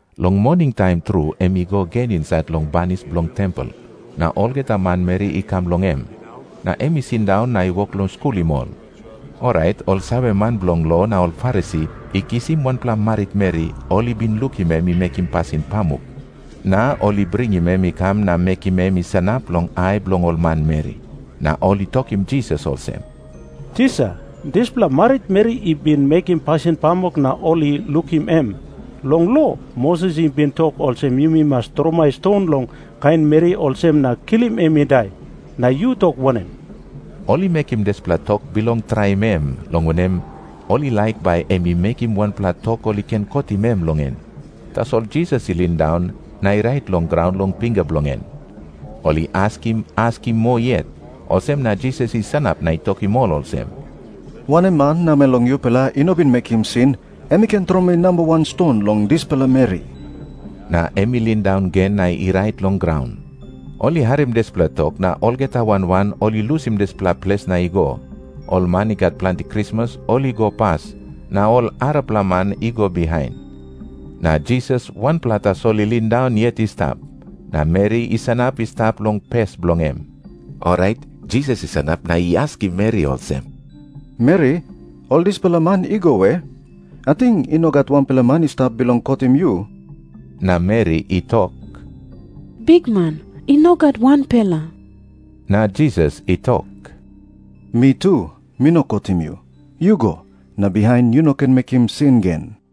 Long moningtaim tru em i go gen insait long banis bilong tempel. Na olgeta manmeri i kam long em. Na em i sindaun na i wok long skulim ol. Orait ol saveman bilong lo na ol Farisi i kisim wanpela maritmeri ol i bin lukim em i mekim pasin pamuk, na ol i bringim em i kam na mekim em i sanap long ai bilong ol manmeri. Na ol i tokim Jisas olsem, “Tisa, dispela maritmeri i bin mekim pasin pamuk na ol i lukim em. Long lo, Moses i bin tok olsem yumi mas tromoi ston long kain meri olsem na kilim em i dai. Na yu tok wanem?” Ol i mekim dispela tok bilong traim em, long wanem, ol i laik bai em i mekim wanpela tok ol i ken kotim em long en. Tasol Jisas i lindaun na i rait long graun long pinga bilong en. Ol i askim askim moa yet, olsem na Jisas i sanap na i tokim ol olsem, “Wanem man namel long yupela i no bin mekim sin, em i ken tromoi namba wan ston long dispela meri.” Na em i lindaun gen na i rait long graun. Ol i harim dispela tok, na olgeta wan wan ol i lusim dispela ples na i go. Ol man i gat planti krismas ol i go pas, na ol arapela man i go bihain. Na Jisas wanpela tasol i lindaun yet i stap, na meri i sanap i stap long pes bilong em. Orait Jisas i sanap na i askim meri olsem, “Meri, ol dispela man i go we? Ating i no gat wanpela man i stap bilong kotim yu?” Na meri i tok, “Bikman, i no gat wanpela.” Na Jisas i tok, “Mi tu, mi no kotim yu. Yu go, na bihain yu no ken mekim sin gen.”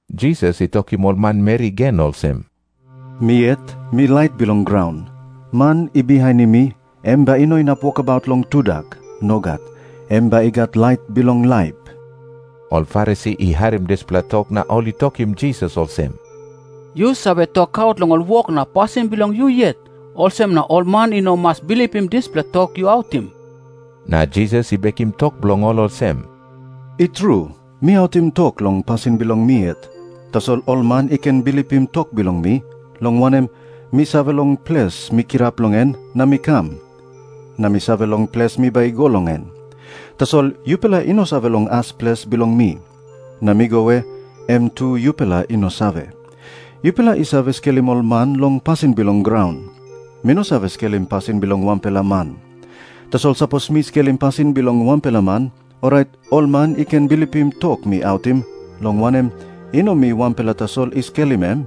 Jisas i tokim ol manmeri gen olsem, “Mi yet mi lait bilong graun. Man i bihainim mi, em bai i no inap wokabaut long tudak. Nogat. Em bai i gat lait bilong laip.” Ol Farisi i harim dispela tok na ol i tokim Jisas olsem, “Yu save tokaut long ol wok na pasin bilong yu yet. Olsem na ol man i no mas bilipim dispela tok yu autim.” Na Jisas i bekim tok bilong ol olsem, “I tru, mi autim tok long pasin bilong mi yet. Tasol ol man i ken bilipim tok bilong mi, long wanem, mi save long ples mi kirap long en na mi kam, na mi save long ples mi bai i go long en. Tasol yupela i no save long as ples bilong mi. Na mi go we, em tu yupela i no save. Yupela i save skelim ol man long pasin bilong graun. Mi no save skelim pasin bilong wanpela man. Tasol sapos mi skelim pasin bilong wanpela man, orait ol man i ken bilipim tok mi autim, long wanem, i no mi wanpela tasol i skelim em.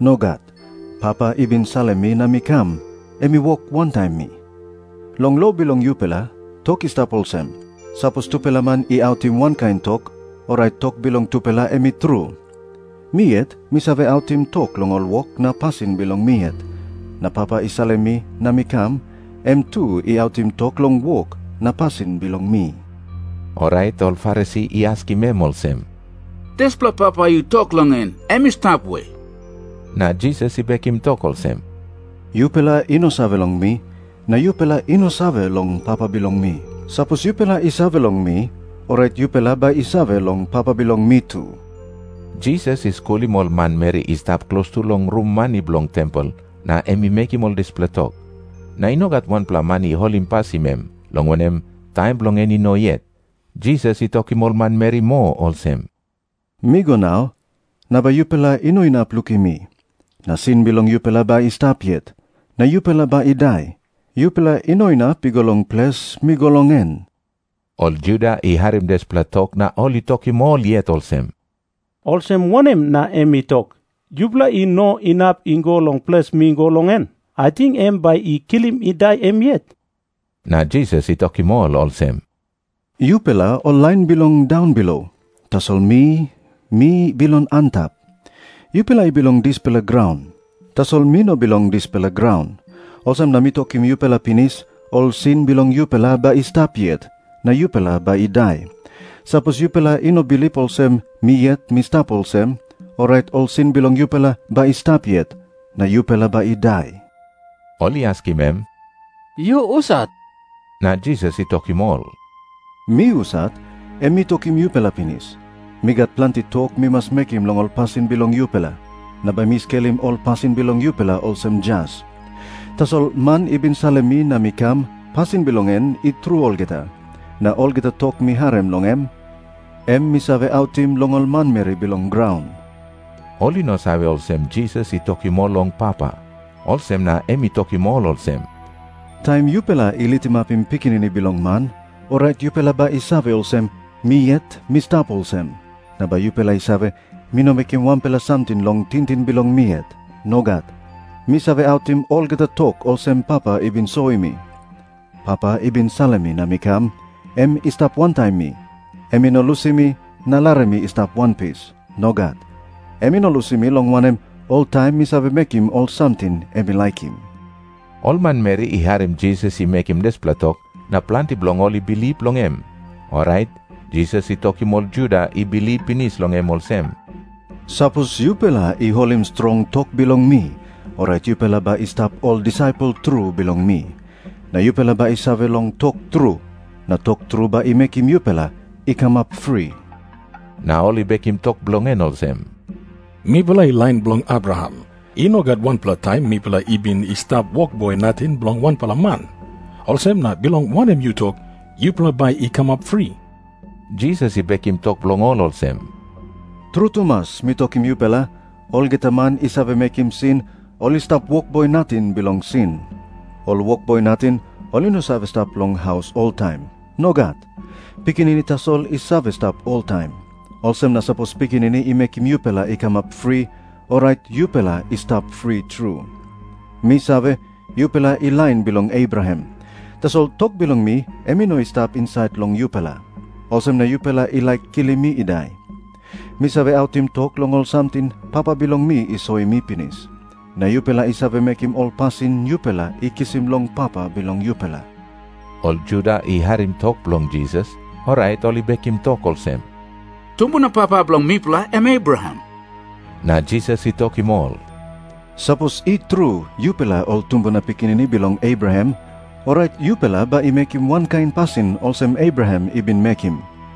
Nogat. Papa i bin salim mi na mi kam, em i wok wantaim mi. Long lo bilong yupela, tok i stap olsem. Sapos tupela man i autim wankain tok, orait tok bilong tupela em i tru. Mi yet mi save autim tok long ol wok na pasin bilong mi yet, na Papa i salim mi na mi kam, em tu i autim tok long wok na pasin bilong mi.” Orait ol Farisi i askim em olsem, “Dispela Papa yu tok long en, em i stap we?” Na Jisas i bekim tok olsem, “Yupela i no save long mi, na yupela i no save long Papa bilong mi. Sapos yupela i save long mi, orait yupela bai i save long Papa bilong mi tu.” Jisas i skulim ol manmeri i stap klostu long rum mani bilong tempel, na em i mekim ol dispela tok. Na i no gat wanpela man i holimpasim em, long wanem, taim bilong en i no yet. Jisas i tokim ol manmeri moa olsem, “Mi go nau, na bai yupela i no inap lukim mi. Na sin bilong yupela bai i stap yet, na yupela bai i dai. Yupela i no inap i go long ples mi go long en.” Ol Juda i harim dispela tok na ol i tokim ol yet olsem, “Olsem wanem na em i tok, ‘Yupela i no inap i go long ples mi go long en’? Ating em bai i kilim i dai em yet?” Na Jisas i tokim ol olsem, “Yupela ol lain bilong daunbilo. Tasol mi, mi bilong antap. Yupela i bilong dispela graun. Tasol mi no bilong dispela graun. Olsem na mi tokim yupela pinis, ol sin bilong yupela bai i stap yet, na yupela bai i dai. Sapos yupela i no bilip olsem Mi Yet Mi Stap Olsem, orait ol sin bilong yupela bai i stap yet, na yupela bai i dai.” Ol i askim em, “Yu husat?” Na Jisas i tokim ol, “Mi husat, em mi tokim yupela pinis. Mi gat planti tok mi mas mekim long ol pasin bilong yupela. Na bai mi skelim ol pasin bilong yupela olsem jas. Tasol Man i bin salim mi na mi kam, pasin bilong en i tru olgeta. Na olgeta tok mi harim long em, em mi save autim long ol manmeri bilong graun.” Ol i no save olsem Jisas i tokim ol long Papa, olsem na em i tokim ol olsem, “Taim yupela i litimapim Pikinini Bilong Man, orait yupela bai i save olsem, Mi Yet Mi Stap Olsem. Na bai yupela i save, mi no mekim wanpela samting long tingting bilong mi yet. Nogat. Mi save autim olgeta tok olsem Papa i bin soim mi. Papa i bin salim mi na mi kam, em i stap wantaim mi. Em i no lusim mi, na larim mi i stap wanpis. Nogat. Em i no lusim mi, long wanem, oltaim mi save mekim ol samting em i laikim.” Ol manmeri i harim Jisas i mekim dispela tok, na planti bilong ol i bilip long em. Orait Jisas i tokim ol Juda i bilip pinis long em olsem, “Sapos yupela i holim strong tok bilong mi, orait yupela bai i stap ol disaipel tru bilong mi. Na yupela bai i save long tok tru, na tok tru bai i mekim yupela i kamap fri.” Na ol i bekim tok bilong en olsem, “Mipela i lain bilong Abraham. I no gat wanpela taim mipela i bin i stap wokboi nating bilong wanpela man. Olsem na bilong wanem yu tok, ‘Yupela bai i kamap fri’?” Jisas i bekim tok bilong ol olsem, “Tru tumas mi tokim yupela, olgeta man i save mekim sin, ol i stap wokboi nating bilong sin. Ol wokboi nating ol i no save stap long haus oltaim. Nogat. Pikinini tasol i save stap oltaim. Olsem na sapos Pikinini i mekim yupela i kamap fri, orait yupela i stap fri tru. “Mi save, yupela i lain bilong Abraham. Tasol tok bilong mi em i no i stap insait long yupela. Olsem na yupela i laik kilim mi i dai. Mi save autim tok long ol samting Papa bilong mi i soim mi pinis. Na yupela i save mekim ol pasin yupela i kisim long papa bilong yupela.” Ol Juda i harim tok bilong Jisas, orait ol i bekim tok olsem, “Tumbuna papa bilong mipela em Abraham.” Na Jisas i tokim ol, “Sapos i tru yupela ol tumbuna pikinini bilong Abraham, orait yupela bai i mekim wankain pasin olsem Abraham i bin mekim.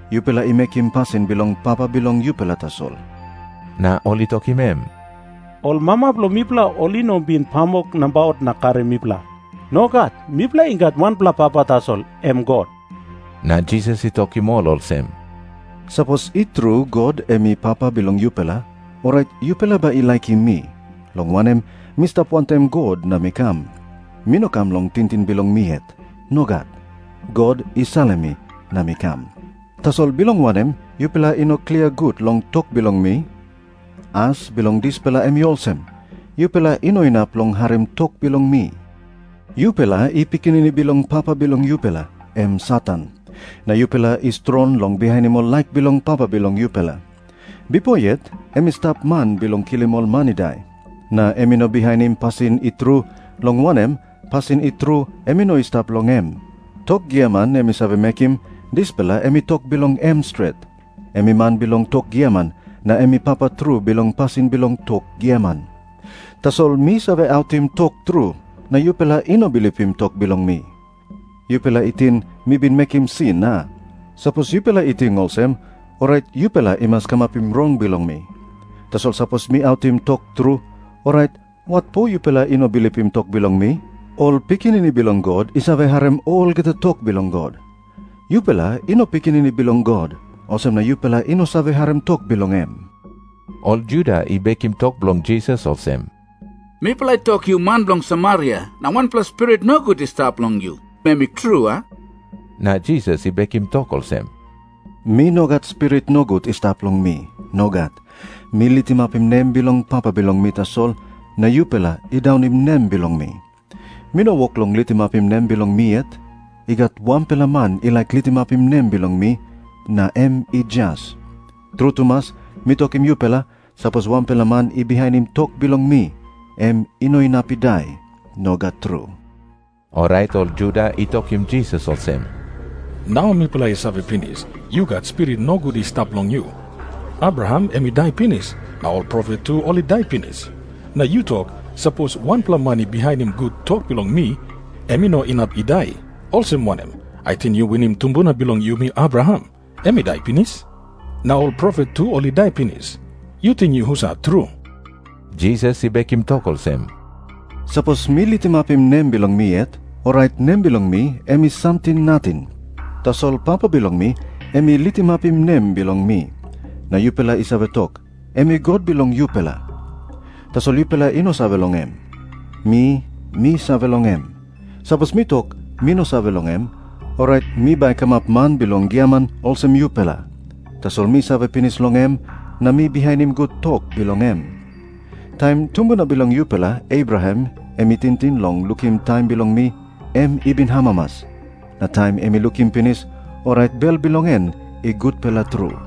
Yupela i mekim pasin bilong papa bilong yupela tasol.” Na ol i tokim em, “Ol mama bilong mipela ol i no bin pamuk nabaut na karim mipela. Nogat. Mipela i gat wanpela Papa tasol, em God.” Na Jisas i tokim ol olsem, “Sapos i tru God em i Papa bilong yupela, orait yupela bai i laikim mi, long wanem, mi stap wantaim God na mi kam. Mi no kam long tingting bilong mi yet. Nogat. God i salim mi na mi kam. “Tasol bilong wanem yupela i no klia gut long tok bilong mi? As bilong dispela em i olsem. Yupela i no inap long harim tok bilong mi. Yupela i pikinini bilong papa bilong yupela, em Satan. Na yupela i strong long bihainim ol laik bilong papa bilong yupela. Bipo yet em i stap man bilong kilim ol man i dai. Na em i no bihainim pasin i tru, long wanem, pasin i tru em i no i stap long em. Tok giaman em i save mekim, dispela em i tok bilong em stret. Em i man bilong tok giaman, na em i papa tru bilong pasin bilong tok giaman. Tasol mi save autim tok tru, na yupela i no bilipim tok bilong mi. Yupela i ting mi bin mekim sin, a? Sapos yupela i ting olsem, orait yupela i mas kamapim rong bilong mi. Tasol sapos mi autim tok tru, orait watpo yupela i no bilipim tok bilong mi? Ol pikinini bilong God i save harim olgeta tok bilong God. Yupela i no pikinini bilong God, olsem na yupela i no save harim tok bilong em.” Ol Juda i bekim tok bilong Jisas olsem, “Mipela i tok yu man bilong Samaria na wanpela spirit nogut i stap long yu, em i tru, a?” Na Jisas i bekim tok olsem, “Mi no gat spirit nogut i stap long mi. Nogat. Mi litimapim nem bilong Papa bilong mi tasol, na yupela i daunim nem bilong mi. Mi no wok long litimapim nem bilong mi yet. I gat wanpela Man i laik litimapim nem bilong mi, na em i jas. Tru tumas mi tokim yupela, sapos wanpela man i bihainim tok bilong mi, em i no inap i dai. Nogat tru.” Orait ol Juda i tokim Jisas olsem, “Nau mipela i save pinis, yu gat spirit nogut i stap long yu. Abraham em i dai pinis, na ol profet tu ol i dai pinis. Na yu tok, ‘Sapos wanpela man i bihainim gut tok bilong mi, em i no inap i dai.’ Olsem wanem? Ating yu winim tumbuna bilong yumi, Abraham? Em i dai pinis. Na ol profet tu ol i dai pinis. Yu ting yu husat tru?” Jisas i bekim tok olsem, “Sapos mi litimapim nem bilong mi yet, orait nem bilong mi em i samting nating. Tasol Papa bilong mi, em i litimapim nem bilong mi. Na yupela i save tok, em i God bilong yupela. Tasol yupela i no save long em. Mi, mi save long em. Sapos mi tok, ‘Mi no save long em,’ orait mi bai kamap man bilong giaman olsem yupela. Tasol mi save pinis long em, na mi bihainim gut tok bilong em. “Taim tumbuna bilong yupela Abraham em i tingting long lukim taim bilong mi, em i bin amamas. Na taim em i lukim pinis, orait bel bilong en i gutpela tru.”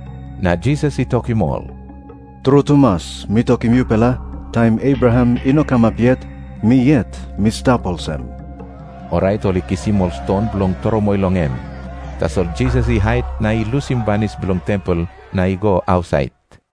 Na Jisas i tokim ol, “Tru tumas mi tokim yupela, taim Abraham i no kamap yet, Mi Yet Mi Stap Olsem.” Orait ol i kisim ol ston bilong tromoi long em. Tasol Jisas i hait na i lusim banis bilong tempel na i go ausait.